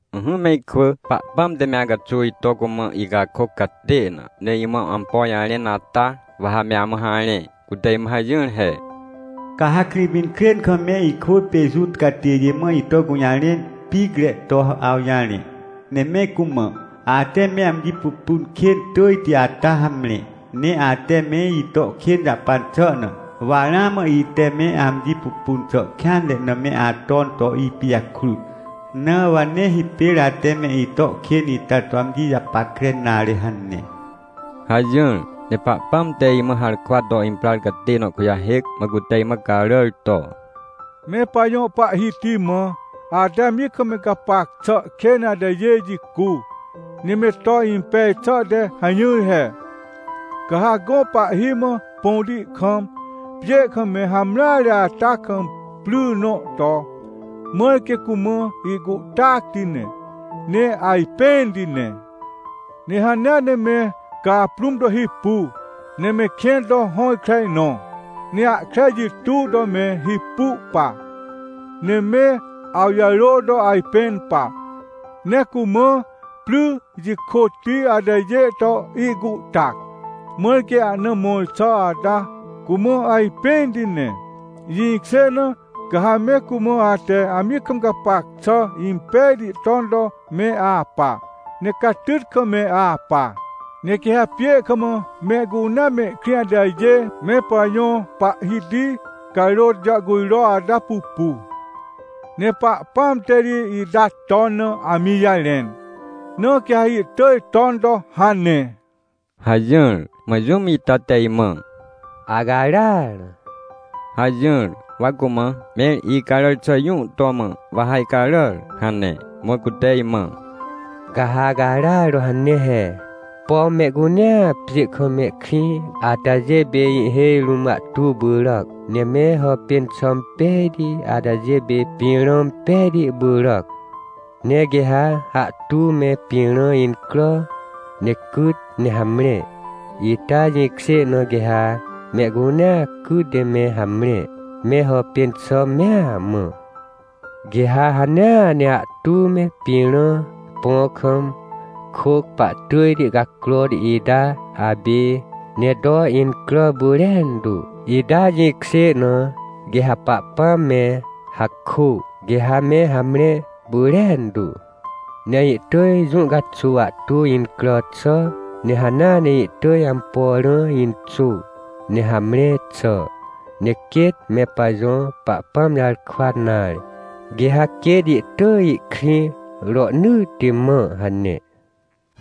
Ỹhỹ me ikwỳ, Pahpãm te me acaxuw ito cumã ihcakôc catê na, ne imã ampo jarẽn ata, wa ha me amã harẽ. Cute imã hajỹr he: “Ca ha Krĩpinkrên kam me ikwỳ pê Juta catêjê mã ito gũjarẽn picre to awjarẽ, ne me cumã: ‘Ate me amji pupun kên tỳjti ata hamre. Ne ate me ito kên jahpan xà na, wa ramã ite me amji pupun xà kêanre na me aton to ipijakrut, na wa nee hipêr ate me ito kên ita to amji japackre nare’ hane” hajỹr. Ne Pahpãm te imã harkwa to imprar catê nõ kujahêc, mã cute imã caràr to: “Me pajõ Pahhiti mã, ate amji kam me gapac xà kên atajê jicu, ne me to impej xà te hajỹr he: Ca ha gõ pahhi mã põti kam, pjê kam me hamreare ata kam pry nõ to, mãr quê cumã ihcuhtacti ne, ne ajpẽnti ne. Ne hanea ne me caprũm to hipu, ne me kẽn to hõkre nõ, ne ahkre jituw to me hipu pa, ne me awjarô to ajpẽn pa, ne cumã pry jikôtti atajê to ihcuhtac, mãr quê ahna mõr xà ata cumã ajpẽnti ne. Jĩkjê na, ca ha me cumã ate amji kam gapac xà impejti ton to me apa, ne catyt kam me apa. Ne quê ha pjê kam mehcunea mehkrĩ atajê me pajõ Pahhiti carôt jàhcujro ata pupu. Ne Pahpãam te ri ita ton na amji jarẽn, na quê ha ihtỳj ton to hane” hajỹr. Mã jũm ita te imã: “Acaràr!” hajỹr. Wa cumã: “Mẽr icaràr xà jũ to mã, wa ha icaràr?” hane. Mã cute imã: “Ca ha acaràr to hane he: ‘Pom mehcunea pjê kam mehkrĩ atajê pê ihhêj rũm ahtu pyràc, ne me hàpên xà impejti atajê pê pĩrã pejti pyràc! Ne quê ha ahtu me pĩrã incrà, ne cyt ne hamre, ita jĩkjê na, quê ha mehcunea cyt ne me hamre, me hàpên xà mea mã! Quê ha hanea ne ahtu me pĩrã põ kam kôc pahtỳjti cacrohti ita apê, ne to incrà pyrentu, ita jĩkjê na, quê ha Pahpãm me hakô, quê ha me hamre pyrentu! Ne ihtỳj jũ caxuw ahtu incrà xà, ne hanea ne ihtỳj ampo rã inxô, ne hamre xà. Ne quêt me pajõ Pahpãm jarkwa nare, quê ha quêt ihtỳj ihkrĩ rohnỳtti mã!’ hane”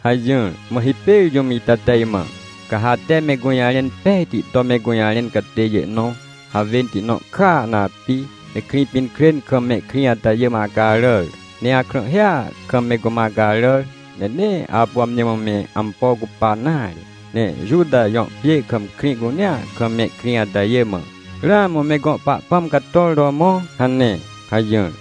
hajỹr. Mã hipêr jũm ita te imã: “Ca ha ate me gũjarẽn pejti to me gũjarẽn catêjê nõ, hawênti nõ kàa na api, ne Krĩpinkrên kam mehkrĩ atajê mã acaràr, ne akrãhhia kam me cumã acaràr, ne nee apu amji mã me ampo cupa nare. Ne Juta jõ pjê kam krĩ cunea kam mehkrĩ atajê mã: ‘Ramã me gõ Pahpãm cator to mõ!’ hane” hajỹr.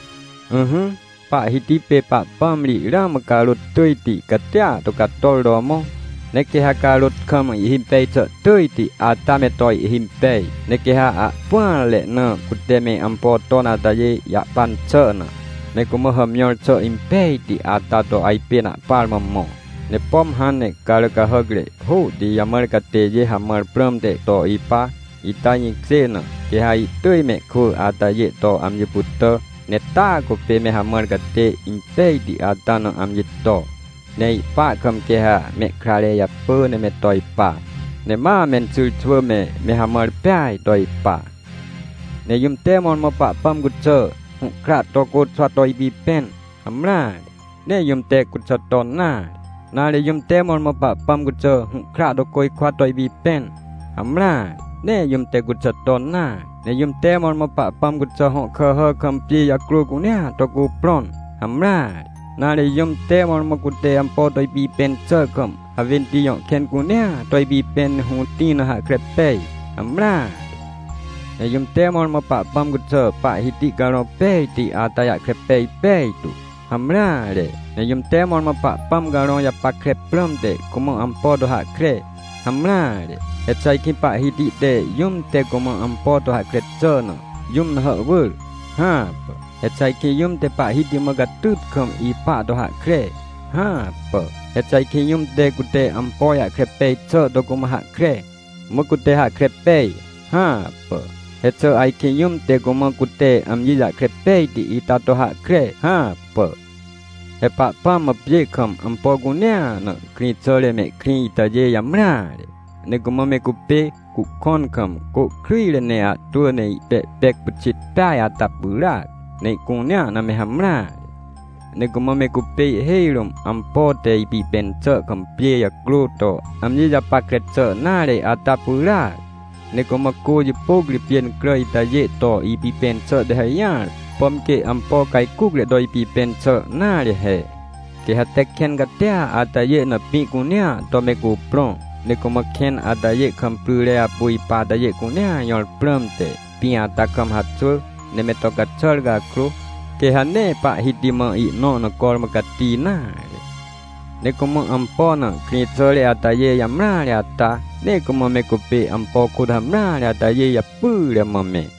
Ỹhỹ, Pahhiti pê Pahpãm ri ramã carôt tỳjti catia to cator to mõ! Ne quê ha carôt kam ihhimpej xà tỳjti ata me to ihhimpej. Ne quê ha ahpỹanre na cute me ampo ton atajê jahpan xà na, me cumã hàmjõr xà impejti ata to ajpên ahpar mã mõ. Ne pom hãn ne carà cahàcre hôhti jamãr catêjê hamãr prãmte to ipa, ita jĩkjê na, quê ha ihtỳj mehkwỳ atajê to amji pytà, ne taa cupê me hamãr catê impejti ata na amji to. Ne ihpa kam quê ha mehkrare japỳ ne me to ipa, ne ma menxyrxwỳ me, me hamãr peaj to ipa. Ne jũm te mõrmõ Pahpãm cuxà, hũhkra to côxwa to ipipẽn? Hamreare, nee jũm te cuxà ton nare! Nare, jũm te mõrmõ Pahpãm cuxà, hũhkra to côjkwa to ipipẽn? Hamreare, nee jũm te cuxà ton nare! Ne jũm te mõrmõ Pahpãm cuxà, hõ kàhà kam pjê jacrô cunea to cuprõn? Hamreare! Nare, jũm te mõrmõ, cute ampo to ipipẽn xà kam, hawênti jõ kẽn cunea to ipipẽn ne hũtĩ na hahkre pej? Hamreare! Ne jũm te mõrmõ Pahpãm cuxà, Pahhiti Carõ Pejti ata jahkre pej pejtu? Hamreare! Ne jũm te mõrmõ Pahpãm Carõ japackre prãmte, cumã ampo to hahkre? Hamreare! He xà ajkĩ Pahhiti te, jũm te cumã ampo to hahkre xà na, jũm na hàhwỳr? Hãpà! He xà ajkĩ jũm te Pahhiti mã catyt kam ipa to hahkre? Hãpà! He xà ajkĩ jũm te, cute ampo jahkre pej xà to cumã hahkre, mã cute hahkre pej? Hãpà. He xà ajkĩ jũm te cumã cute amji jahkre pejti ita to hahkre? Hãpà! He Pahpãm mã pjê kam ampo cunea na, krĩxàre mehkrĩ itajê jamreare. Ne cumã me cupê cuhkõn kam, cô kryjre ne ahtwỳ ne ihpehpec pyxit peaj ata pyràac, ne ihcunea na me hamreare. Ne cumã me cupê ihhêj rũm ampo te ipipẽn xà kam pjê jacrô to amji japackre xà nare ata pyràac. Ne cumã cô jipôc ri pjêncrà itajê to ipipẽn xà te hajỹar, pom quê ampo cajcucre to ipipẽn xà nare he. Quê ha te kẽn catia atajê na pĩ cunea to me cuprõ, ne cumã kẽn atajê kam pryre apu ipa atajê cunea jõr prãmte, pĩ ata kam haxwỳ ne me to caxàr cakrô, quê ha nee Pahhiti mã ihnõ na cormã cati nare! Ne cumã ampo na, krĩxàre atajê jamreare ata, ne cumã me cupê ampo kôt hamreare atajê japyre mã me.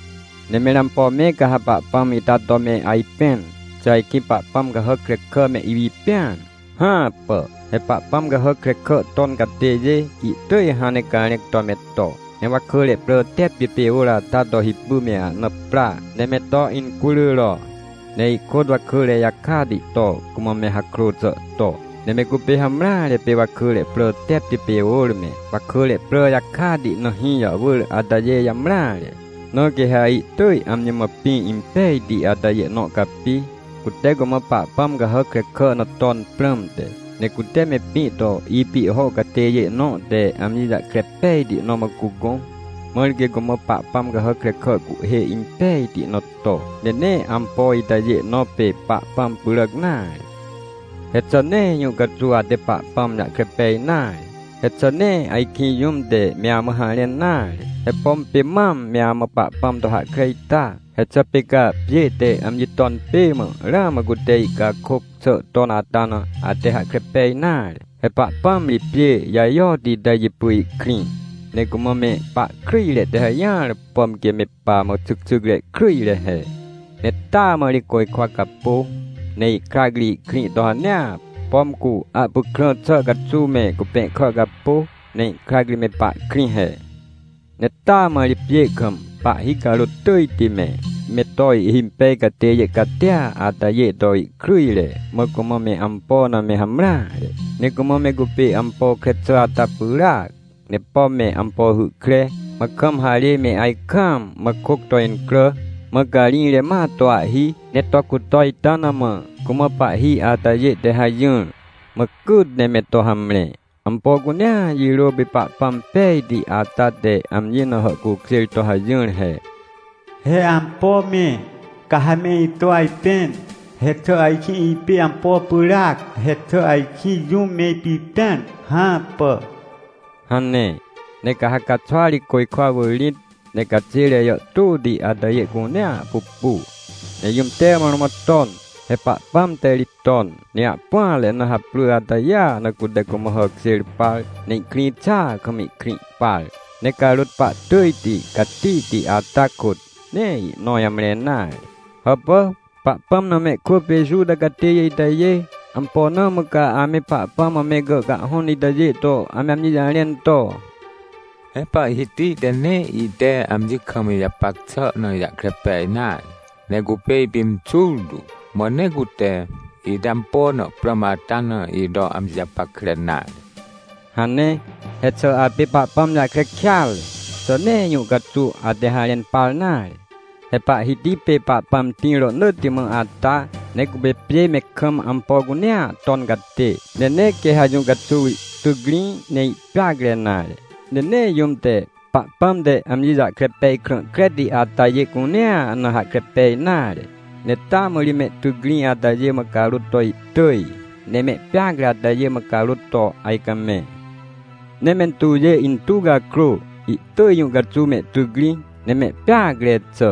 Ne mẽr ampo me ca ha Pahpãm ita to me ajpẽn? Xà ajkĩ pahpãm cahàc krekà me ipipẽan? Hãpà! He pahpãm cahàc krekà ton catêjê, ihtỳj hãn ne carẽc to me to, ne wakỳre prà tepti pê ôr ata to hipy me ahna pra ne me to incururo, ne ihkôt wakỳre jakati to, cumã me hakrô xà to. Ne me cupê hamreare pê wakỳre prà tepti pê ôr me, wakỳre prà jakati na hĩ jàhwỳr atajê jamreare, na quê ha ihtỳj amji mã pĩ impejti atajê nõ capi, cute cumã pahpãm cahàc krekà na ton prãmte. Ne cute me pĩ to ipihho catêjê nõ te amji jahkre pejti nõ mã cugõ, mãr quê cumã pahpãm cahàc krekà cuhhê impejti nõ to. Ne nee ampo itajê nõ pê Pahpãm pyràc nare. He xà nee jũ caxuw ate Pahpãm jahkre pej nare? He xà nee ajkĩ jũm te me amã harẽn nare? He pom pê mam me amã Pahpãm to hahkre ita? He xà pê ca, pjê te amji ton pê mã, ramã cute ihcakôc xà ton ata na, ate hahkre pej nare? He Pahpãm ri pjê jajoti ita jipy ihkrĩ, ne cumã me pahkryjre te hajỹar, pom quê me pamã xycxycre kryjre he. Ne taa mã ri côjkwa capô, ne ihkrac ri ihkrĩ to hanea, pom cu ahpykrã xà caxuw me cupẽhkà capô, ne ihkrac ri me pahkrĩ he. Ne taa mã ri pjê kam, pahhi carôt tỳjti me, me to ihhimpej catêjê catia atajê to ihkryjre, mã cumã me ampo na me hamreare. Ne cumã me cupê ampo kre xà ata pyràac, ne pom me ampo hy kre, mã kam harê me ajkaam, mã kôc to incrà, mã carĩjre ma to ahhi, ne to cuto ita na mã, cumã pahhi atajê te hajỹr, mã cyt ne me to hamre. Ampo cunea jirô pê Pahpãm pejti ata te amji na hàhcukjêr to hajỹr he: “He ampo me, ca ha me ito ajpẽn? He xà ajkĩ ipê ampo pyràc? He xà ajkĩ jũm me ipipẽan? Hãpà” hane. Ne ca ha caxwa ri côjkwa wỳr rĩt, ne caxêre jàhtôti atajê cunea pupu, ne jũm te mõrmõ ton? He Pahpãm te ri ton, ne ahpỹanre na haprỳ atajêa na, cute cumã hàkjêr par, ne ihkrĩ xàa kam ihkrĩ par. Ne carôt pahtỳjti catihti ata kôt, nee ihnõ jamre nare. Hàpà, Pahpãm na mehkwỳ pê Juta catêjê itajê! Ampo na mã ca ame Pahpãm mã me gàhcahhõn itajê to ame amji jarẽn to: “He Pahhiti te nee ite amji kam ijapac xà na ijahkre pej nare, ne cupê ipimxur tu. Mã nee cute, ite ampo na prãm ata na ito amji japackre nare” hane? He xà apê Pahpãm jahkre kêatre? Xà nee jũ caxuw ate harẽn par nare? He Pahhiti pê Pahpãm tĩr rohnỳtti mã ata, ne cupê pjê me kam ampo cunea ton catê. Ne nee quê ha jũ caxuw ihtycrĩ, ne ihpeacre nare. Ne nee jũm te, Pahpãm te amji jahkre pej krã kreti atajê cunea na hahkre pej nare. Ne taa mã ri mehtycrĩ atajê mã carôt to ihtỳj, ne mehpeacre atajê mã carôt to ajcamẽ. Ne mentuwjê intuw cakrô, ihtỳj jũ caxuw mehtycrĩ, ne mehpeacre xà.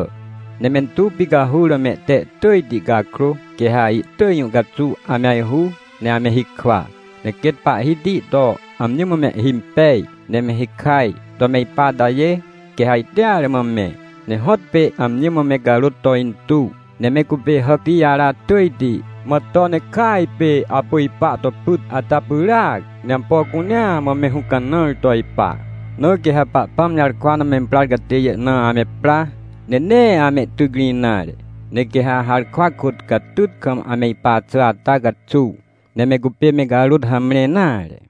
Ne mentuw picahur na mehte tỳjti cakrô, quê ha ihtỳj jũ caxuw ame ajhu, ne ame hikwa. Ne quêt Pahhiti to amji mã mehhimpej, ne me hikaj to me ipa atajê, quê ha ajteare mã me, ne hõtpê amji mã me carôt to intuw. Ne me cupê hàcti jara tỳjti, mã to ne kỳaj pê apu ipa to pyt ata pyràac, ne ampo cunea mã me hũcanãr to ipa. Na quê ha Pahpãm jarkwa na memprar catêjê na ame pra, ne nee amehtycrĩ nare. Ne quê ha harkwa kôt catyt kam ame ipa xà ata caxuw, nee me cupê me carôt hamre nare.